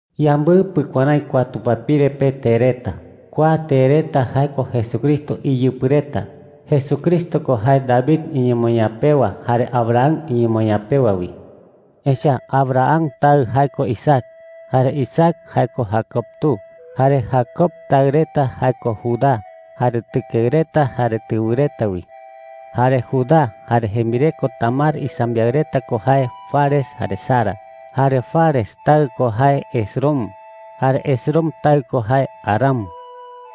Yambɨpɨ kuärái kua tupapire pe tee reta. Kua tee reta jae ko Jesucristo iyɨpɨ reta. Jesucristo ko jae David iñemoñaa pewa jare Abraham iñemoñaa pewa wi. Echa’ä Abraham taɨ jae ko Isaac, jare Isaac jae ko Jacob tu, jare Jacob taɨ reta jae ko Judá jare tɨkeɨ reta jare tɨwɨ reta wi. Jare Judá jare jembireko Tamar isambiaɨ reta ko jae Fares jare Zara. Jare Fares taɨ ko jae Esrom, jare Esrom taɨ ko jae Aram.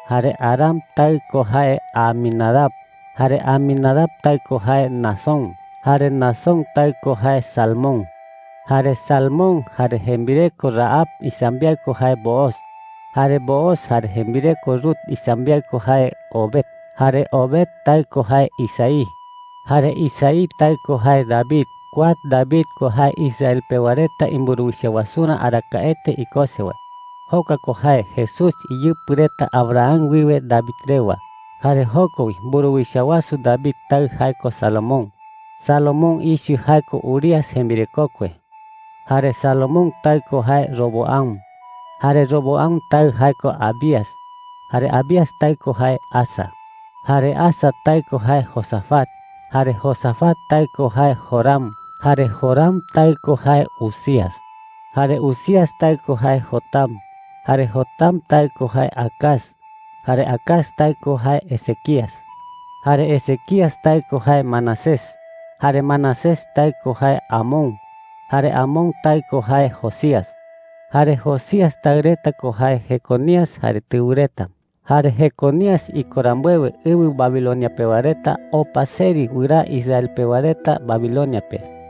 Jare Aram taɨ ko jae Aminadab, jare Aminadab taɨ ko jae Naasón, jare Naasón taɨ ko jae Salmón. Jare Salmón jare jembireko Rahab isambiaɨ ko jae Booz. Jare Booz jare jembireko Rut isambiaɨ ko jae Obed. Jare Obed taɨ ko jae Isaí. Jare Isaí taɨ ko jae David. Kua David ko jae Israel pewa reta imburuwicha wasurä arakaete ikose wae. Jokua ko jae Jesús iyɨpɨ reta Abraham wiwe David rewa. Jare joko wi mburuwicha wasu David taɨ jae ko Salomón. Salomón ichɨ jae ko Urías jembirekokue. Jare Salomón taɨ ko jae Roboam, jare Roboam taɨ ko jae Abías, jare Abías taɨ ko jae Asa. Jare Asa taɨ ko jae Josafat, jare Josafat taɨ ko jae Joram, jare Joram taɨ ko jae Uzías. Jare Uzías taɨ ko jae Jotam, jare Jotam taɨ ko jae Acaz, jare Acaz taɨ ko jae Ezequías. Jare Ezequías taɨ ko jae Manasés, jare Manasés taɨ ko jae Amón, jare Amón taɨ ko jae Josías. Jare Josías taɨ reta ko jae Jeconías jare tɨwɨ reta. Jare Jeconías iko rambuewe, ɨwɨ Babilonia pewa reta opa seri wɨraa Israel pewa reta Babilonia pe.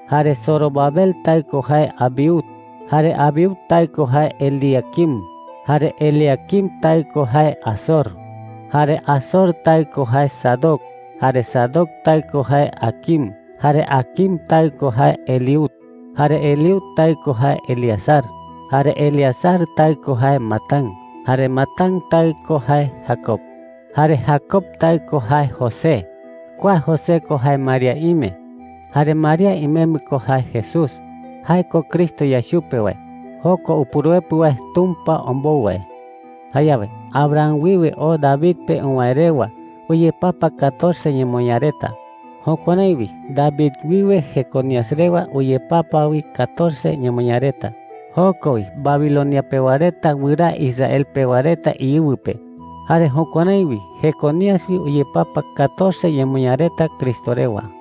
Jare Zorobabel taɨ ko jae Abiud, jare Abiud taɨ ko jae Eliaquim, jare Eliaquim taɨ ko jae Azor. Jare Azor taɨ ko jae Sadoc, jare Sadoc taɨ ko jae Aquim, jare Aquim taɨ ko jae Eliud. Jare Eliud taɨ ko jae Eleazar, jare Eleazar taɨ ko jae Matán, jare Matán taɨ ko jae Jacob. Jare Jacob taɨ ko jae José. Kua José ko jae María ime. Jare María imembɨ ko jae Jesús. Jae ko Cristo yae chupe wae – jokua Upuruepɨ wae Tumpa ombou wae. Jayawe Abraham wiwe oo David pe uwäe rewa uyepapa catorce ñemoñaa reta. Jukuärái wi David wiwe Jeconías rewa uyepapa wi catorce ñemoñaa reta. Joko wi Babilonia pewa reta wɨraa Israel pewa reta iɨwɨ pe. Jare jukuärái wi Jeconías wi uyepapa catorce ñemoñaa reta Cristo rewa.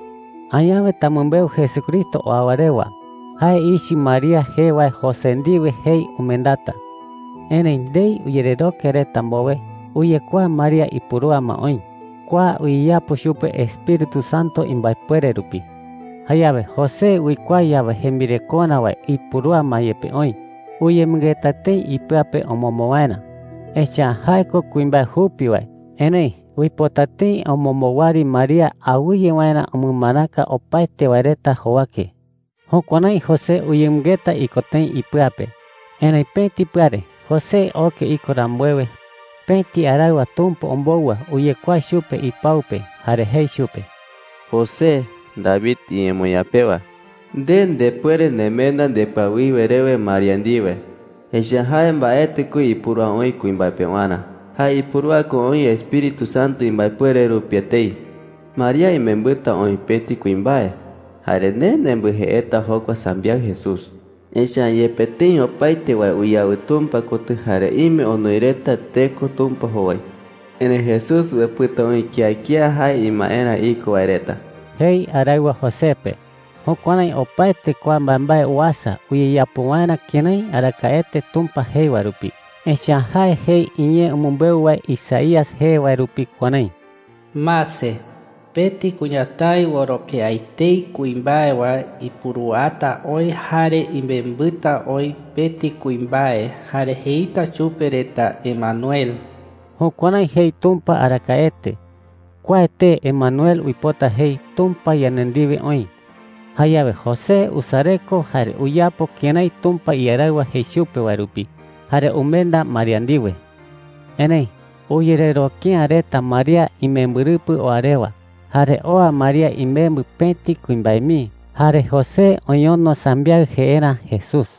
Añawe tamɨmbeu Jesucristo oa wae rewa. Jae ichɨ María jee wae José ndiwe jei umendata. Erëi ndei uyereroke reta mbowe, uyekuaa María ipurúa ma oï. Kua uyeyapo chupe Espíritu Santo imbaepuere rupi. Jayawe José uikuaa yawe jembirekorä wae ipurúa ma yepe oï, uyemɨngeta tëi ipɨa pe omombo waerä. Echa’ä jae ko kuimbae jupi wae. Erëi uipota tëi omombo wɨari María awɨye waerä umɨmaraka opaete wae reta jowake. Jukuärái José uyemɨngeta iko tëi ipɨa pe. Erëi pëti pɨare, José oke iko rambuewe, pëti araɨwa Tumpa ombou wae uyekuaa chupe ipau pe jare jei chupe: “José, David iñemoñaa pewa,” jei chupe. “Nde ndepuere nemenda ndepɨawiwe rewe María ndiwe, echa’ä jae mbaetɨ ko ipurúa oï kuimbae pewarä. Jae ipurúa ko oï Espíritu Santo imbaepuere rupi etei,” jei chupe. “María imembɨta oï pëti kuimbae jare nde nembɨjeeta jokua sambiaɨ Jesús. Tee Jesús uipota jei jae reta iñee pe “yandeYa upuruepɨ.” Echa’ä yepe tëi opaete wae uyawɨ Tumpa kotɨ jare ime onoi reta teko Tumpa jowai, erëi Jesús uepɨta oï kía kía jae imaerä iko wae reta,” jei araɨwa José pe. Jukuärái opaete kua mbaembae uasa uyeyapo waerä kërái arakaete Tumpa jei wae rupi. Echa’ä jae jei iñee umɨmbeu wae Isaías jee wae rupi kuärái: “Mase, pëti kuñatái oroke’ä etei kuimbae wae ipuruata oï jare imembɨta oï pëti kuimbae. Jare jeita chupe reta Emanuel.” Jukuärái jei Tumpa arakaete. Kua tee Emanuel uipota jei, “Tumpa yande ndiwe oï.” Jayawe José usareko jare uyapo kërái Tumpa iaraɨwa jei chupe wae rupi jare umenda María ndiwe. Erëi uyereroke’ä reta María imembɨrɨpɨ oa rewa. Jare oa María imembɨ pëti kuimbae mii jare José oñono sambiaɨ jeerä Jesús.